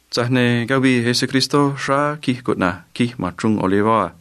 Tza̱j ne̱ cavii Jesucristó xráá quij cuꞌna̱j Quij ma̱n Chruun Olivó a.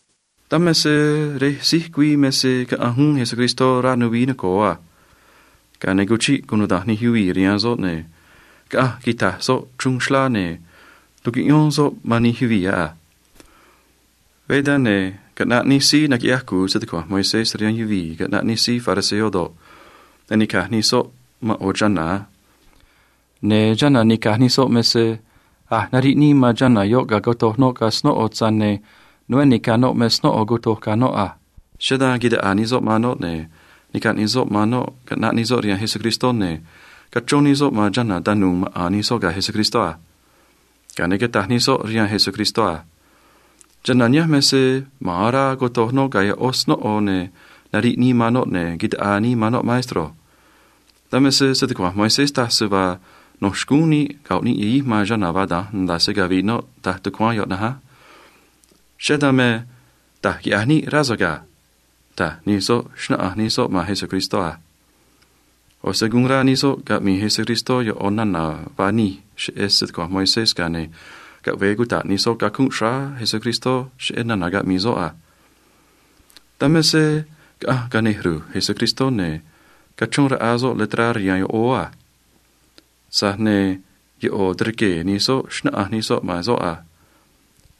Dan me se rej síj güii me se caꞌanj uún Jesucristó rá nuvií noco̱o a. Ga̱a ne̱ cuchiꞌ cunuda̱nj nij yuvii̱ rihaan soꞌ, ne̱ caꞌanj quita̱j soꞌ chruun xlá, ne̱ tucuꞌyón soꞌ man nij yuvii̱ yoꞌ a. Veé dan, ne̱ caꞌnaꞌ nij síí naquiꞌyaj cu̱u se‑tucua̱nj Moisés rihaan yuvii̱ caꞌnaꞌ nij síí fariseo do̱ꞌ, ne̱ nica̱j nij soꞌ man ꞌo̱ chana̱ a. Ne̱ chana̱ nica̱j nij soꞌ me se a̱j nariꞌ nii man chana̱ yoꞌ ga̱a cotoj noꞌ ga̱ snóꞌo, tza̱j ne̱ nuveé ni̱ca̱ noꞌ me snóꞌo cotoj ga̱ noꞌ a. Cheꞌé dan quitaꞌaa nij soꞌ man noꞌ, ne̱ nica̱j nij soꞌ man noꞌ caꞌnaꞌ nij soꞌ rihaan Jesucristó, ne̱ cachrón nij soꞌ man chana̱ tanu̱u̱ maꞌa̱n nij soꞌ ga̱ Jesucristó a. Ga̱a ne̱ cataj nij soꞌ rihaan Jesucristó a: ―Chana̱ nihánj me se ma̱a̱n orá cotoj noꞌ ga̱ yoꞌó snóꞌo, ne̱ nariꞌ nii man noꞌ, ne̱ quitaꞌaa nii man noꞌ, maestro. Dan me se se‑tucua̱nj Moisés taj se vaa no̱ xcúún níꞌ go̱ꞌ níꞌ yahij man chana̱ vaa da̱nj nda̱a se cavi̱ꞌ noꞌ, taj tucuáán yoꞌ na̱nj á. Cheꞌé dan me, da̱j quiꞌya̱j níꞌ, rá so̱ꞌ ga̱ ―taj nij soꞌ, xnáꞌanj nij soꞌ man Jesucristó a. ꞌO̱ se guun rá nij soꞌ caꞌmi̱i̱ Jesucristó yoꞌo̱ nana̱ vaa nij cheꞌé se‑tucua̱nj Moisés, ga̱a ne̱ caꞌve̱e cuta̱ꞌ nij soꞌ cacunꞌ xráá Jesucristó cheꞌé nana̱ caꞌmi̱i̱ soꞌ a. Dan me se caꞌanj cane̱ ru̱j Jesucristó, ne̱ cachrón raꞌa soꞌ letrá rihaan yoꞌóó a. Tza̱j ne̱ yoꞌo̱ tirquee̱ nij soꞌ xnáꞌanj nij soꞌ man soꞌ a.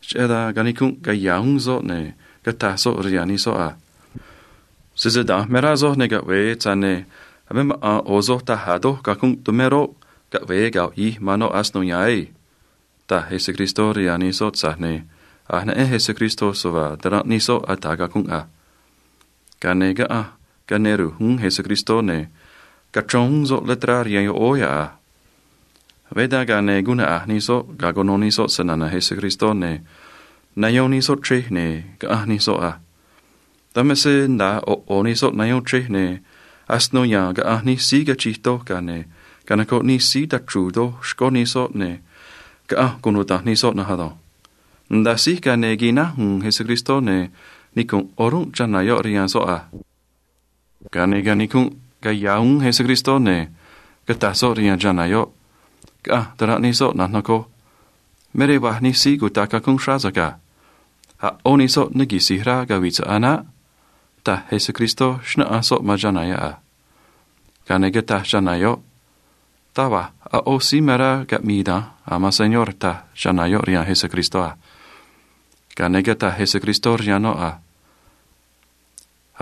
Cheꞌé dan canicunꞌ caya̱ uún soꞌ, ne̱ cataj soꞌ rihaan nij soꞌ a: ―Sese da̱nj me rá soj, ne̱ caꞌve̱e, tza̱j ne̱ a̱ me maꞌa̱n ꞌo̱ soj taj a̱ doj cacunꞌ tumé roꞌ, caꞌve̱e go̱ꞌ yahij man noꞌ asino ya̱a̱n ei ―taj Jesucristó rihaan nij soꞌ, tza̱j ne̱ a̱j neꞌen Jesucristó se vaa taranꞌ nij soꞌ ata̱ cacunꞌ a. Ga̱a ne̱ caꞌanj cane̱ ru̱j uún Jesucristó, ne̱ cachrón uún soꞌ letrá rihaan yoꞌóó yoꞌ a. Veé dan, ga̱a ne̱ guun naꞌa̱j nij soꞌ ga̱a cuno nij soꞌ se‑na̱na̱ Jesucristó, ne̱ nayón nij soꞌ chrej, ne̱ caꞌanj nij soꞌ a. Dan me se nda̱a ꞌo̱ ꞌo̱ nij soꞌ nayón chrej, ne̱ asino ya̱a̱n caꞌanj nij síí cachij doj, ga̱a ne̱ canocoꞌ nij síí tachru̱u̱ doj xcó nij soꞌ, ne̱ caꞌanj cunuda̱nj nij soꞌ na̱nj ado̱nj. Nda̱a síj, ga̱a ne̱ quináj u̱u̱n Jesucristó, ne̱ nicu̱nꞌ o̱rúnꞌ chana̱ yoꞌ rihaan soꞌ a. Ga̱a ne̱ canicunꞌ caya̱ uún Jesucristó, ne̱ cataj soꞌ rihaan chana̱ yoꞌ: ―Caꞌanj taranꞌ nij soꞌ, na̱nj nocoj. Me rej vaj nij síí cutaꞌ cacunꞌ xráá so̱ꞌ ga̱. A̱ ꞌó nij soꞌ ne quisi̱j rá cavi̱ꞌ so̱ꞌ a̱ naꞌ ―taj Jesucristó, xnáꞌanj soꞌ man chana̱ yoꞌ a. Ga̱a ne̱ cataj chana̱ yoꞌ: ―Taj va̱j a̱ ꞌó síí me rá caꞌmi̱i̱ da̱nj, a̱ man Señor ―taj chana̱ yoꞌ rihaan Jesucristó a. Ga̱a ne̱ cataj Jesucristó rihaan noꞌ a: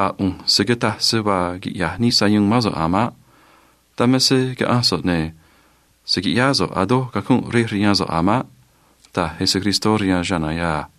―A̱ ꞌu̱nj se̱ cataj se vaa quiꞌya̱j nii sayuun mán so̱ꞌ a̱ maꞌ. Dan me se caꞌa̱nj so̱ꞌ, ne̱ se̱ quiꞌyáá so̱ꞌ a̱ doj cacunꞌ rej rihaan so̱ꞌ a̱ maꞌ ―taj Jesucristó rihaan chana̱ yoꞌ a.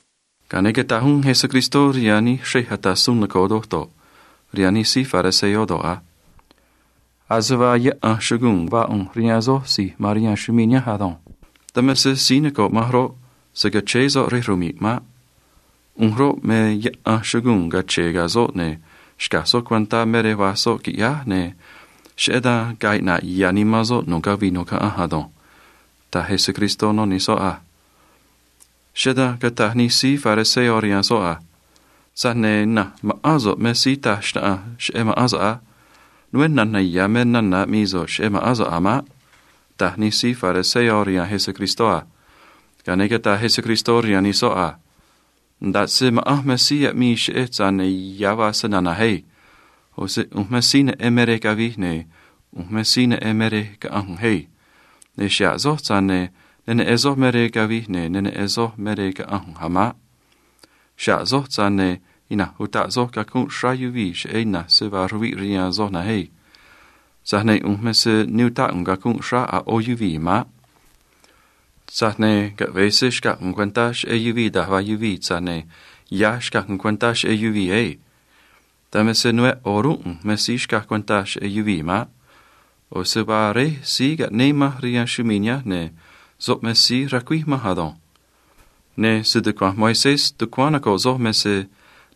Ga̱a ne̱ cataj uún Jesucristó rihaan nij xrej ata̱ suun noco̱o doj do̱ꞌ, rihaan nij síí fariseo do̱ꞌ a: ―Ase vaa yaꞌan chuguu̱n vaa ꞌu̱nj rihaan soj si̱j ma̱n rihaan chumii̱ nihánj ado̱nj. Dan me se síí noco̱ꞌ manj roꞌ, se̱ cachéé soꞌ rej rmi̱ꞌ maꞌ. ꞌU̱nj roꞌ, me yaꞌan chuguu̱n cache̱e̱ ga̱ soꞌ, ne̱ xca̱j soꞌ cuentá me rej vaj soꞌ, qui̱ꞌyáj, ne̱ cheꞌé dan ga̱a̱ iꞌna̱ꞌ ya̱ nimán soꞌ nu̱ꞌ cavii nu̱ꞌ caꞌanj ado̱nj ―taj Jesucristó no nij soꞌ a. Cheꞌé dan cataj nij síí fariseo rihaan soꞌ a: ―Tza̱j ne̱ ina̱nj ma̱ꞌán so̱ꞌ me síí taj xnaꞌanj cheꞌé ma̱ꞌán so̱ꞌ á. Nuveé na̱na̱ ya̱ me nana̱ aꞌmii so̱ꞌ cheꞌé ma̱ꞌán so̱ꞌ a̱ maꞌ ―taj nij síí fariseo rihaan Jesucristó a. Ga̱a ne̱ cataj Jesucristó rihaan nij soꞌ a: ―Nda̱ꞌ se ma̱ꞌanj me síí aꞌmii cheꞌej, tza̱j ne̱ ya̱ vaa se‑na̱na̱j ei. ꞌO̱ se ꞌu̱nj me síí neꞌen me rej cavij, ne̱ ꞌu̱nj me síí neꞌen me rej caꞌa̱nj ꞌu̱nj ei. Ne̱ xa̱ꞌ soj, tza̱j ne̱ ne neꞌen soj me rej cavij ne neꞌen soj me rej caꞌa̱nj ꞌu̱nj a̱ maꞌ. Xa̱ꞌ soj, tza̱j ne̱ ina̱nj utaꞌ soj cacunꞌ xráá yuvii̱ cheꞌé ina̱nj se vaa ruviꞌ rihaan soj na̱nj ei. Tza̱j ne̱ ꞌu̱nj me se ne utáꞌ ꞌu̱nj cacunꞌ xráá a̱ ꞌó yuvii̱ maꞌ. Tza̱j ne̱ caꞌve̱e se xca̱j ꞌu̱nj cuentá cheꞌé yuvii̱ da̱j vaa yuvii̱, tza̱j ne̱ ya̱ xcaj ꞌu̱nj cuentá cheꞌé yuvii̱ ei. Dan me se nuveé o̱rúnꞌ ꞌu̱nj me síí xcaj cuentá cheꞌé yuvii̱ maꞌ. ꞌO̱ se vaa Réj síí caꞌnéé manj rihaan chumii̱ nihánj, ne̱ soꞌ me síí racuíj manj ado̱nj. Ne̱ se‑tucua̱nj Moisés tucuáán noco̱ꞌ soj me se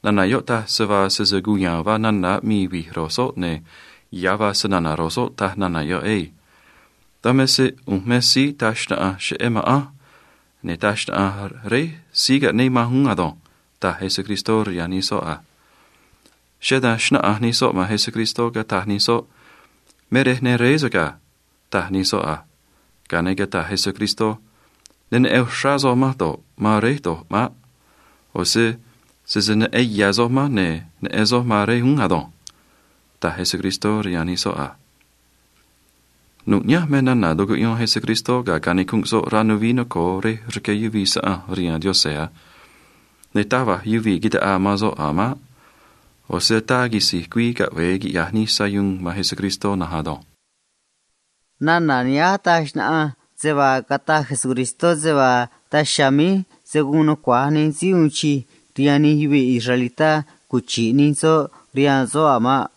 nana̱ yoꞌ taj se vaa sese cuya̱a̱n vaa nana̱ aꞌmii vi̱j ro̱j soꞌ, ne̱ ya̱ vaa se‑na̱na̱ ro̱j soꞌ, taj nana̱ yoꞌ ei. Dan me se ꞌu̱nj me síí taj xnaꞌanj cheꞌé ma̱ꞌanj, ne̱ taj xnaꞌanj Réj síí caꞌnéé manj uún ado̱nj ―taj Jesucristó rihaan nij soꞌ a. Cheꞌé dan xnáꞌanj nij soꞌ man Jesucristó, cataj nij soꞌ: ―Me rej ne réé so̱ꞌ ga̱ ―taj nij soꞌ a. Ga̱a ne̱ cataj Jesucristó: ―Ne neꞌen uxrá soj manj do̱ꞌ, man Réj do̱ꞌ maꞌ. ꞌO̱ se sese neꞌen ya̱ soj manj, ne̱ neꞌen soj man Réj uún ado̱nj ―taj Jesucristó rihaan nij soꞌ a. Nu̱ꞌ nihánj me nana̱ tucuꞌyón Jesucristó ga̱a canicunꞌ soꞌ rá nuvií noco̱o rej rqué yuvii̱ saꞌanj rihaan Diose̱ a. Ne̱ taj va̱j yuvii̱ quitaꞌaa man soꞌ a̱ maꞌ. ꞌO̱ se ataa quisi̱j güii caꞌve̱e quiꞌya̱j nii sayuun man Jesucristó na̱nj ado̱nj. Nana̱ nihánj taj xnaꞌanj se vaa cataj Jesucristó se vaa daj chiha̱a̱ míj se̱ guun nucua̱j nij síí uun chij rihaan nij yuvii̱ israelitá cuchi̱ꞌ nij soꞌ rihaan soꞌ a̱ maꞌ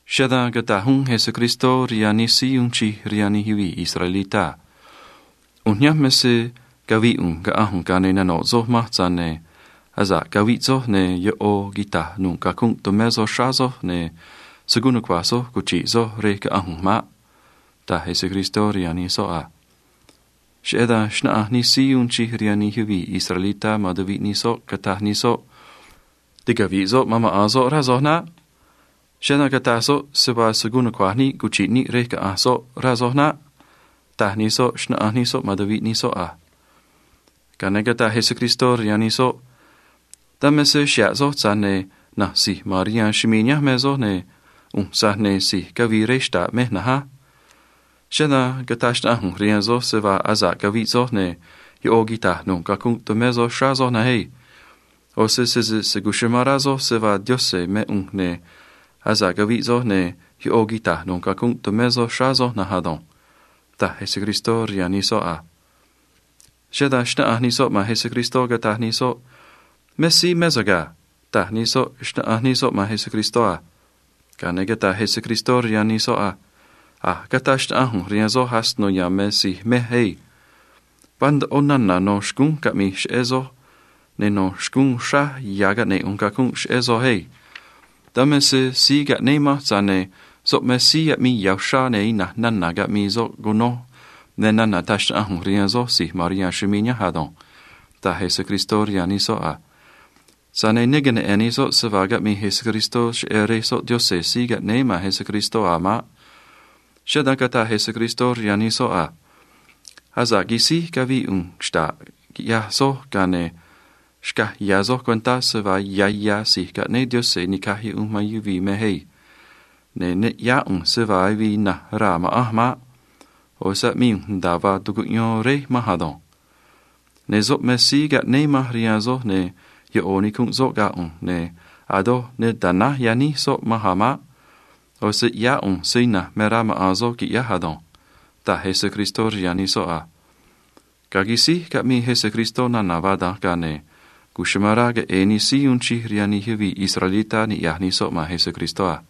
Cheꞌé dan cataj uún Jesucristó rihaan nij síí uun chij rihaan nij yuvii̱ israelitá a: ―ꞌU̱nj nihánj me se cavi̱i̱ ꞌu̱nj caꞌa̱nj ꞌu̱nj, ga̱a ne̱ nano̱ꞌ soj manj, tza̱j ne̱ asa̱ꞌ caviꞌ soj, ne̱ yoꞌo̱ quita̱j nu̱ꞌ cacunꞌ tumé soj xráá soj, ne̱ se̱ guun nucua̱j soj cuchi̱ꞌ soj rej caꞌa̱nj ꞌu̱nj maꞌ ―taj Jesucristó rihaan nij soꞌ a. Cheꞌé dan xnáꞌanj nij síí uun chij rihaan nij yuvii̱ israelitá man tuviꞌ nij soꞌ, cataj nij soꞌ: ―Ticavi̱ꞌ soꞌ man maꞌa̱n soꞌ, rá soj naꞌ. Cheꞌé dan cataj soꞌ se vaa se̱ guun nucua̱j níꞌ cuchi̱ꞌ níꞌ rej caꞌa̱nj soꞌ, rá soj naꞌ ―taj nij soꞌ, xnáꞌanj nij soꞌ man tuviꞌ nij soꞌ a. Ga̱a ne̱ cataj Jesucristó rihaan nij soꞌ: ―Dan me se xa̱ꞌ soj, tza̱j ne̱ na̱nj si̱j ma̱n rihaan chumii̱ nihánj me soj, ne̱ ꞌu̱nj, tza̱j ne̱ si̱j cavii rej xta̱ꞌ mej na̱nj á. Cheꞌé dan cataj xnaꞌanj ꞌu̱nj rihaan soj se vaa asa̱ꞌ caviꞌ soj, ne̱ yoꞌo̱ quita̱j nu̱ꞌ cacunꞌ tumé soj xráá soj na̱nj ei. ꞌO̱ se sese se̱ cuchumán rá soj se vaa Diose̱ mé ꞌu̱nj, ne̱ asa̱ꞌ caviꞌ soj, ne̱ yoꞌo̱ quita̱j nu̱ꞌ cacunꞌ tumé soj xráá soj na̱nj ado̱nj ―taj Jesucristó rihaan nij soꞌ a. Cheꞌé dan xnáꞌanj nij soꞌ man Jesucristó, cataj nij soꞌ: ―Me síí mé so̱ꞌ ga̱ ―taj nij soꞌ, xnáꞌanj nij soꞌ man Jesucristó a. Ga̱a ne̱ cataj Jesucristó rihaan nij soꞌ a: ―A̱j cataj xnaꞌanj ꞌu̱nj rihaan soj asino ya̱a̱n me si̱j mej ei. Vaa ndoꞌo nana̱ no̱ xcúnj caꞌmi̱j cheꞌé soj, ne̱ no̱ xcúún uxraj ya̱ caꞌne̱ꞌ ꞌu̱nj cacunꞌ cheꞌé soj ei. Dan me se síí caꞌnéé manj, tza̱j ne̱ soꞌ me síí aꞌmii ya̱ uxrá, ne̱ ina̱nj nana̱ caꞌmii soꞌ cunoj me nana̱ taj xnaꞌanj ꞌu̱nj rihaan soj si̱j ma̱n rihaan chumii̱ nihánj ado̱nj ―taj Jesucristó rihaan nij soꞌ a. Tza̱j ne̱ ne queneꞌe̱n nij soꞌ se vaa caꞌmii Jesucristó cheꞌé Rej soꞌ Diose̱ síí caꞌnéé man Jesucristó a̱ maꞌ. Cheꞌé dan cataj Jesucristó rihaan nij soꞌ a: ―Asa̱ꞌ quisíj cavii ꞌu̱nj xta̱ꞌ quiꞌyaj soj, ga̱a ne̱ xca̱j ya̱ soj cuentá se vaa ya̱ ya̱ si̱j caꞌnéé Diose̱ ni̱caj yuꞌunj man yuvii̱ mej ei. Ne̱ ne ꞌyáá ꞌu̱nj se vaa avii ina̱nj raa̱ ma̱ꞌanj maꞌ. ꞌO̱ se aꞌmii ꞌu̱nj nda̱a vaa tucuꞌyón Réj manj ado̱nj. Ne̱ soꞌ me síí caꞌnéé manj rihaan soj, ne̱ yoꞌo̱ nicunꞌ soꞌ ga̱ ꞌu̱nj, ne̱ a̱ doj ne ta̱náj yaníj soꞌ manj a̱ maꞌ. ꞌO̱ se ꞌyáá ꞌu̱nj se ina̱nj me rá maꞌa̱n soꞌ qui̱ꞌyáj ado̱nj ―taj Jesucristó rihaan nij soꞌ a. Ga̱a quisíj caꞌmii Jesucristó nana̱ vaa da̱nj, ga̱a ne̱ cuchumán rá queꞌe̱e̱ nij síí uun chij rihaan nij yuvii̱ israelitá niꞌya̱j nij soꞌ man Jesucristó a.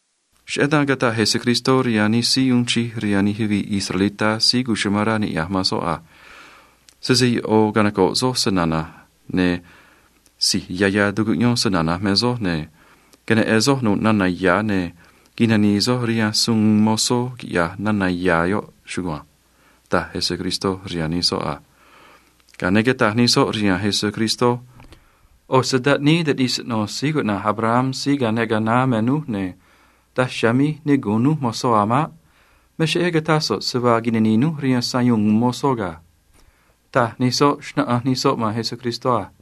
Cheꞌé dan cataj Jesucristó rihaan nij síí uun chij rihaan nij yuvii̱ israelitá síí cuchumán rá niꞌya̱j man soꞌ a: ―Sese yoꞌo̱ canoco̱ꞌ soj se‑na̱na̱j, ne̱ si̱j ya̱ ya̱ tucuꞌyón se‑na̱na̱j me soj, ne̱ queneꞌe̱n soj nu̱ꞌ nana̱ ya̱, ne̱ quinani̱i̱ soj rihaan suun uun mozó, quiꞌya̱j nana̱ ya̱ yoꞌ chugua̱nj ―taj Jesucristó rihaan nij soꞌ a. Ga̱a ne̱ cataj nij soꞌ rihaan Jesucristó: ―ꞌO̱ se taꞌníí taꞌnij siꞌno̱ síí cuꞌna̱j Abraham síí cane ga̱a naá me núj, ne̱ daj chiha̱a̱ míj ne gu̱un núj mozó a̱ maꞌ. Me cheꞌé cataj so̱ꞌ se vaa quinani̱i̱ núj rihaan suun uun mozó ga̱ ―taj nij soꞌ, xnáꞌanj nij soꞌ man Jesucristó a.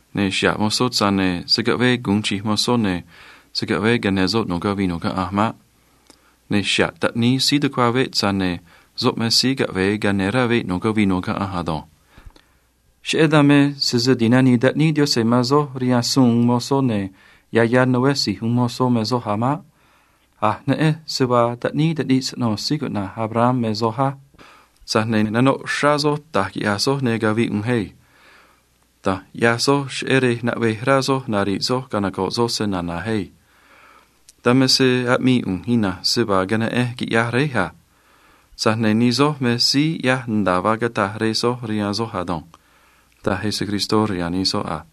Ne̱ xa̱ꞌ mozó, tza̱j ne̱ se̱ caꞌvee gu̱un chij mozó, ne̱ se̱ caꞌvee cane̱ soꞌ nu̱ꞌ cavii nu̱ꞌ caꞌanj maꞌ. Ne̱ xa̱ꞌ taꞌníí síí tucua̱ veꞌ, tza̱j ne̱ soꞌ me síí caꞌve̱e cane̱ rá veꞌ nu̱ꞌ cavii nu̱ꞌ caꞌanj ado̱nj. Cheꞌé dan me sese ti̱nanii taꞌníí Diose̱ man soj rihaan suun uun mozó, ne̱ ya̱ ya̱ nuveé si̱j uun mozó me soj a̱ maꞌ. “A̱j neꞌenj se vaa taꞌníí taꞌnij siꞌno̱ síí cuꞌna̱j Abraham me soj á. Tza̱j ne̱ nanoꞌ uxrá soj da̱j quiꞌya̱j soj ne̱ cavi̱ꞌ ꞌu̱nj ei. Da̱nj ꞌyaj soj cheꞌé rej naꞌvej rá soj nari̱ꞌ soj canoco̱ꞌ soj se‑na̱na̱j ei. Dan me se aꞌmii ꞌu̱nj ina̱nj se vaa queneꞌenj quiꞌyaj Réj a. Tza̱j ne̱ nij soj me síí ꞌyaj nda̱a vaa cataj rej soj rihaan soj ado̱nj ―taj Jesucristó rihaan nij soꞌ a.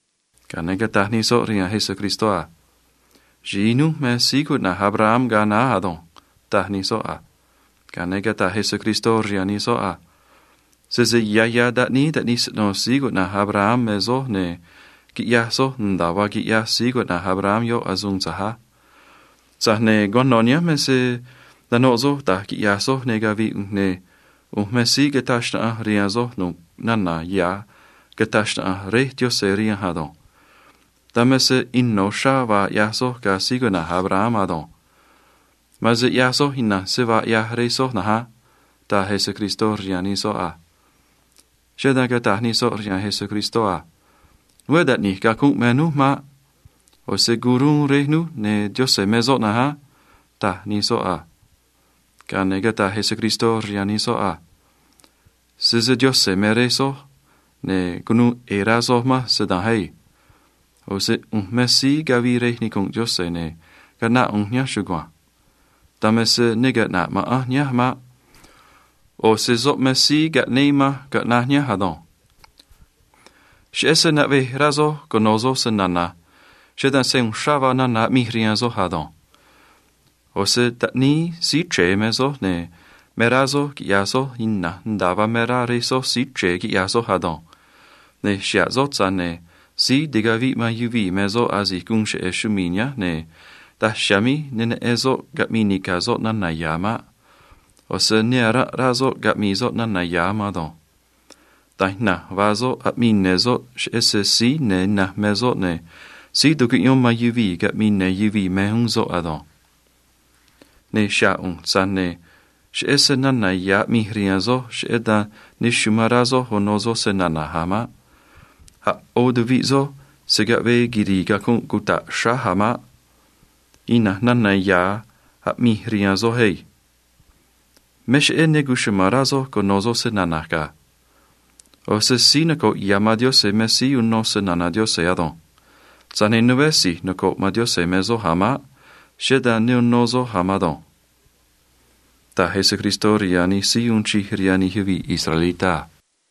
Ga̱a ne̱ cataj nij soꞌ rihaan Jesucristó a: ―Xi̱i núj me síí cuꞌna̱j Abraham ga̱a naá ado̱nj ―taj nij soꞌ a. Ga̱a ne̱ cataj Jesucristó rihaan nij soꞌ a: ―Sese ya̱ ya̱ taꞌníí taꞌnij siꞌno̱ síí cuꞌna̱j Abraham me soj, ne̱ quiꞌyaj soj nda̱a vaa quiꞌyaj síí cuꞌna̱j Abraham yoꞌ asuun tza̱j a. Tza̱j ne̱ cuano̱ nihánj me se nanoꞌ soj da̱j quiꞌya̱j soj ne̱ cavi̱ꞌ ꞌu̱nj, ne̱ ꞌu̱nj me síí cataj xnaꞌanj rihaan soj nu̱ꞌ nana̱ ya̱ cataj xnaꞌanj Réj Diose̱ rihanj ado̱nj. Dan me se ino̱ uxrá vaa ꞌyaj soj ga̱ síí cuꞌna̱j Abraham ado̱nj. Ma̱a̱n se ꞌyaj soj ina̱nj se vaa ꞌyaj rej soj na̱nj á ―taj Jesucristó rihaan nij soꞌ a. Cheꞌé dan cataj nij soꞌ rihaan Jesucristó a: ―Nuveé taꞌni̱j cacunꞌ me núj maꞌ. ꞌO̱ se o̱ruun Rej núj, ne̱ Diose̱ me soꞌ na̱nj á ―taj nij soꞌ a. Ga̱a ne̱ cataj Jesucristó rihaan nij soꞌ a: ―Sese Diose̱ me Rej soj, ne̱ cunuu ꞌe̱e̱ rá soj manj se da̱nj ei. ꞌO̱ se ꞌu̱nj me síí cavii rej nicu̱nꞌ Diose̱, ne̱ caꞌnáꞌ ꞌu̱nj nihánj chugua̱nj. Dan me se ne caꞌna̱ꞌ ma̱ꞌanj nihánj maꞌ. ꞌO̱ se soꞌ me síí caꞌnéé manj caꞌnaj nihánj ado̱nj. “Cheꞌé se naꞌvej rá soj cuno̱ soj se‑na̱na̱j, cheꞌé dan sayu̱u̱n uxrá vaa nana̱ aꞌmij rihaan soj ado̱nj. ꞌO̱ se taꞌníí síí chre̱e me soj, ne̱ me rá soj quiꞌya̱j soj ina̱nj nda̱a vaa me rá rej soj síí chre̱e quiꞌya̱j soj ado̱nj. Ne̱ xa̱ꞌ soꞌ, tza̱j ne̱ síí ticaviꞌ man yuvii̱ me soꞌ asi̱j guun cheꞌe̱ chumii̱ nihánj, ne̱ daj chiha̱a̱ míj ne neꞌen soꞌ caꞌmi̱i̱ nica̱ soꞌ nana̱ ya̱ maꞌ. ꞌO̱ se ne aranꞌ rá soꞌ caꞌmi̱i̱ soꞌ nana̱ ya̱ a̱ man ado̱nj. Da̱nj ina̱nj vaa soꞌ, aꞌmii ne̱ soꞌ, cheꞌé se síí ne̱ ina̱nj me soꞌ, ne̱ síí tucuꞌyón man yuvii̱ caꞌmi̱i̱ ne̱ yuvii̱ me uún soꞌ ado̱nj. “Ne̱ xa̱ꞌ ꞌu̱nj, tza̱j ne̱ cheꞌé se nana̱ ya̱ aꞌmij rihaan soj, cheꞌé dan ne amán rá soj uno soj se‑na̱na̱j a̱ maꞌ. A̱ ꞌó tuviꞌ soj se̱ caꞌvee quiri̱i̱ cacunꞌ cuta̱ꞌ xráj a̱ maꞌ. Ina̱nj nana̱ ya̱ aꞌmij rihaan soj ei. Me cheꞌé ne cuchuma̱n rá soj cuno̱ soj se‑na̱na̱j ga̱. ꞌO̱ se síí noco̱ꞌ ya̱ man Diose̱ me síí uno se‑na̱na̱ Diose̱ ado̱nj. Tza̱j ne̱ nuveé si̱j noco̱ꞌ man Diose̱ me soj a̱ maꞌ. Cheꞌé dan ne uno soj a̱ man ado̱nj ―taj Jesucristó rihaan nij síí uun chij rihaan nij yuvii̱ israelitá a.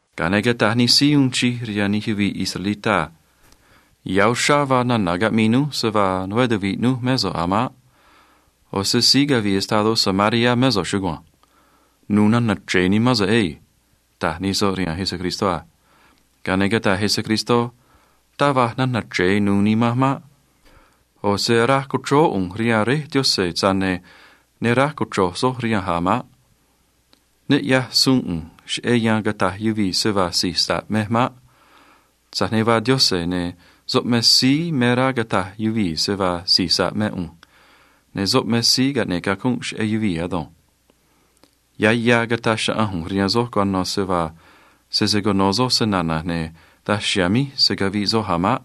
Ga̱a ne̱ cataj nij síí uun chij rihaan nij yuvii̱ israelitá a: ―Ya̱ uxrá vaa nana̱ caꞌmii núj se vaa nuveé tuvi̱ꞌ núj mé so̱ꞌ a̱ maꞌ. ꞌO̱ se síí cavii estadó Samaria mé so̱ꞌ chugua̱nj. Nu̱u̱ nana̱ chre̱e nimán so̱ꞌ ei ―taj nij soꞌ rihaan Jesucristó a. Ga̱a ne̱ cataj Jesucristó: ―Taj va̱j nana̱ chre̱e nuû nimanj maꞌ. ꞌO̱ se aráj co̱chróó ꞌu̱nj rihaan Réj Diose̱, tza̱j ne̱ ne aráj cochro̱j soj rihanj a̱ maꞌ. Ne ꞌyaj suun ꞌu̱nj cheꞌé yan cata̱j yuvii̱ se vaa si̱j sa̱ꞌ mej maꞌ. Tza̱j ne̱ vaa Diose̱, ne̱ soꞌ me síí me rá cata̱j yuvii̱ se vaa si̱j sa̱ꞌ mé ꞌu̱nj, ne̱ soꞌ me síí caꞌne̱ꞌ cacunꞌ cheꞌé yuvii̱ ado̱nj. Ya̱ ya̱ cata̱j xnaꞌanj ꞌu̱nj rihaan soj cuano̱ se vaa sese cuno̱ soj se‑na̱na̱j, ne̱ daj chiha̱a̱ míj se̱ caviꞌ soj a̱ maꞌ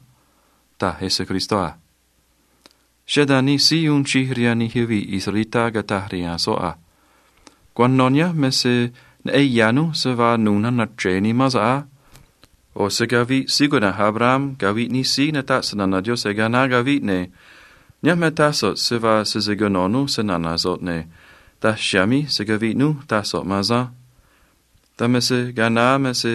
―taj Jesucristó a. Cheꞌé dan nij síí uun chij rihaan nij yuvii̱ israelitá cataj rihaan soꞌ a: ―Cuano̱ nihánj me se neꞌen ya̱ núj se vaa nu̱u̱ nana̱ chre̱e nimán so̱ꞌ á. ꞌO̱ se caviꞌ síí cuꞌna̱j Abraham caviꞌ nij síí nataꞌ se‑na̱na̱ Diose̱ ga̱a naá caviꞌ, ne̱ nihánj me taj so̱ꞌ se vaa sese cuno̱ núj se‑na̱na̱ so̱ꞌ, ne̱ daj chiha̱a̱ míj se̱ caviꞌ núj, taj so̱ꞌ man asanj. Dan me se ga̱a naá me se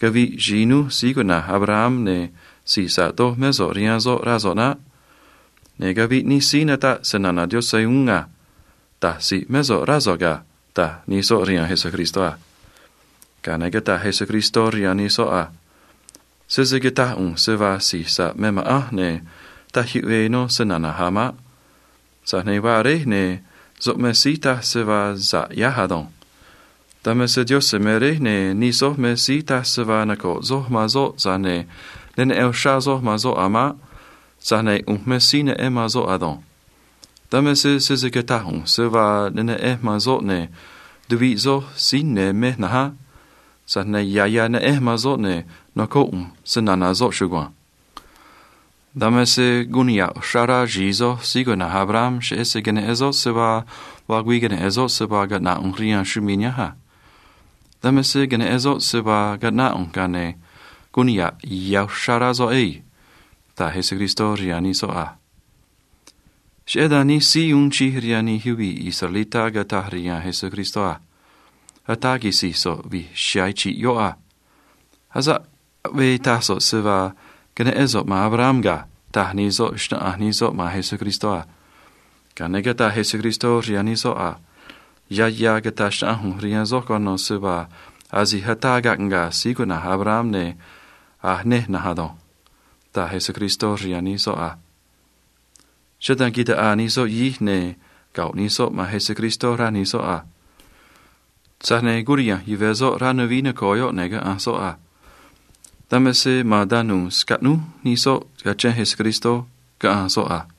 caviꞌ xi̱i núj síí cuꞌna̱j Abraham, ne̱ si̱j sa̱ꞌ doj mé so̱ꞌ rihaan soꞌ, rá so̱ꞌ naꞌ. Ne̱ caviꞌ nij síí nataꞌ se‑na̱na̱ Diose̱ uún a. Da̱j si̱j mé so̱ꞌ, rá so̱ꞌ ga̱ ―taj nij soꞌ rihaan Jesucristó a. Ga̱a ne̱ cataj Jesucristó rihaan nij soꞌ a: ―Sese cata̱j ꞌu̱nj se vaa si̱j sa̱ꞌ me ma̱ꞌanj, ne̱ taj yuꞌvee nó se‑na̱na̱j a̱ maꞌ. Tza̱j ne̱ vaa Réj, ne̱ soꞌ me síí taj se vaa sa̱ꞌ ꞌyáj ado̱nj. Dan me se Diose̱ me Réj, ne̱ nij soj me síí taj se vaa noco̱ꞌ soj man soꞌ, tza̱j ne̱ ne neꞌen uxrá soj man soꞌ a̱ maꞌ. Tza̱j ne̱ ꞌu̱nj me síí neꞌen man soꞌ ado̱nj. Dan me se sese cata̱j ꞌu̱nj se vaa ne neꞌenj man soꞌ, ne̱ tuviꞌ soj síí ne̱ mej na̱nj á. Tza̱j ne̱ ya̱ ya̱ neꞌenj man soꞌ, ne̱ nocóꞌ ꞌu̱nj se‑na̱na̱ soꞌ chugua̱nj. “Dan me se guun niha̱ꞌ uxrá rá xi̱i soj síí cuꞌna̱j Abraham cheꞌé se queneꞌen soꞌ se vaa vaa güii queneꞌe̱n soꞌ se vaa caꞌna̱ꞌ ꞌu̱nj rihaan chumii̱ nihánj a. Dan me se queneꞌen soꞌ se vaa caꞌnáꞌ ꞌu̱nj, ga̱a ne̱ guun niha̱ꞌ ya̱ uxrá rá soꞌ ei ―taj Jesucristó rihaan nij soꞌ a. Cheꞌé dan nij síí uun chij rihaan nij yuvii̱ israelitá cataj rihaan Jesucristó a: ―Ataa quisi̱j so̱ꞌ vi̱j chiha̱a̱ chi̱ꞌ yoꞌ a. Asa̱ꞌ aꞌvee taj so̱ꞌ se vaa queneꞌén so̱ꞌ man Abraham ga̱ ―taj nij soꞌ, xnáꞌanj nij soꞌ man Jesucristó a. Ga̱a ne̱ cataj Jesucristó rihaan nij soꞌ a: ―Ya̱ ya̱ cata̱j xnaꞌanj ꞌu̱nj rihaan soj cuano̱ se vaa asi̱j ataa caꞌnga̱a̱ síí cuꞌna̱j Abraham, ne̱ a̱j nej na̱nj ado̱nj ―taj Jesucristó rihaan nij soꞌ a. Cheꞌé dan quitaꞌaa nij soꞌ yahij, ne̱ go̱ꞌ nij soꞌ man Jesucristó, rá nij soꞌ a. Tza̱j ne̱ curiha̱nj yuve̱ soꞌ rá nuvií noco̱o yoꞌ, ne̱ caꞌanj soꞌ a. Dan me se ma̱a̱n tanu̱u̱ scaꞌnúj nij soꞌ cachén Jesucristó, caꞌanj soꞌ a.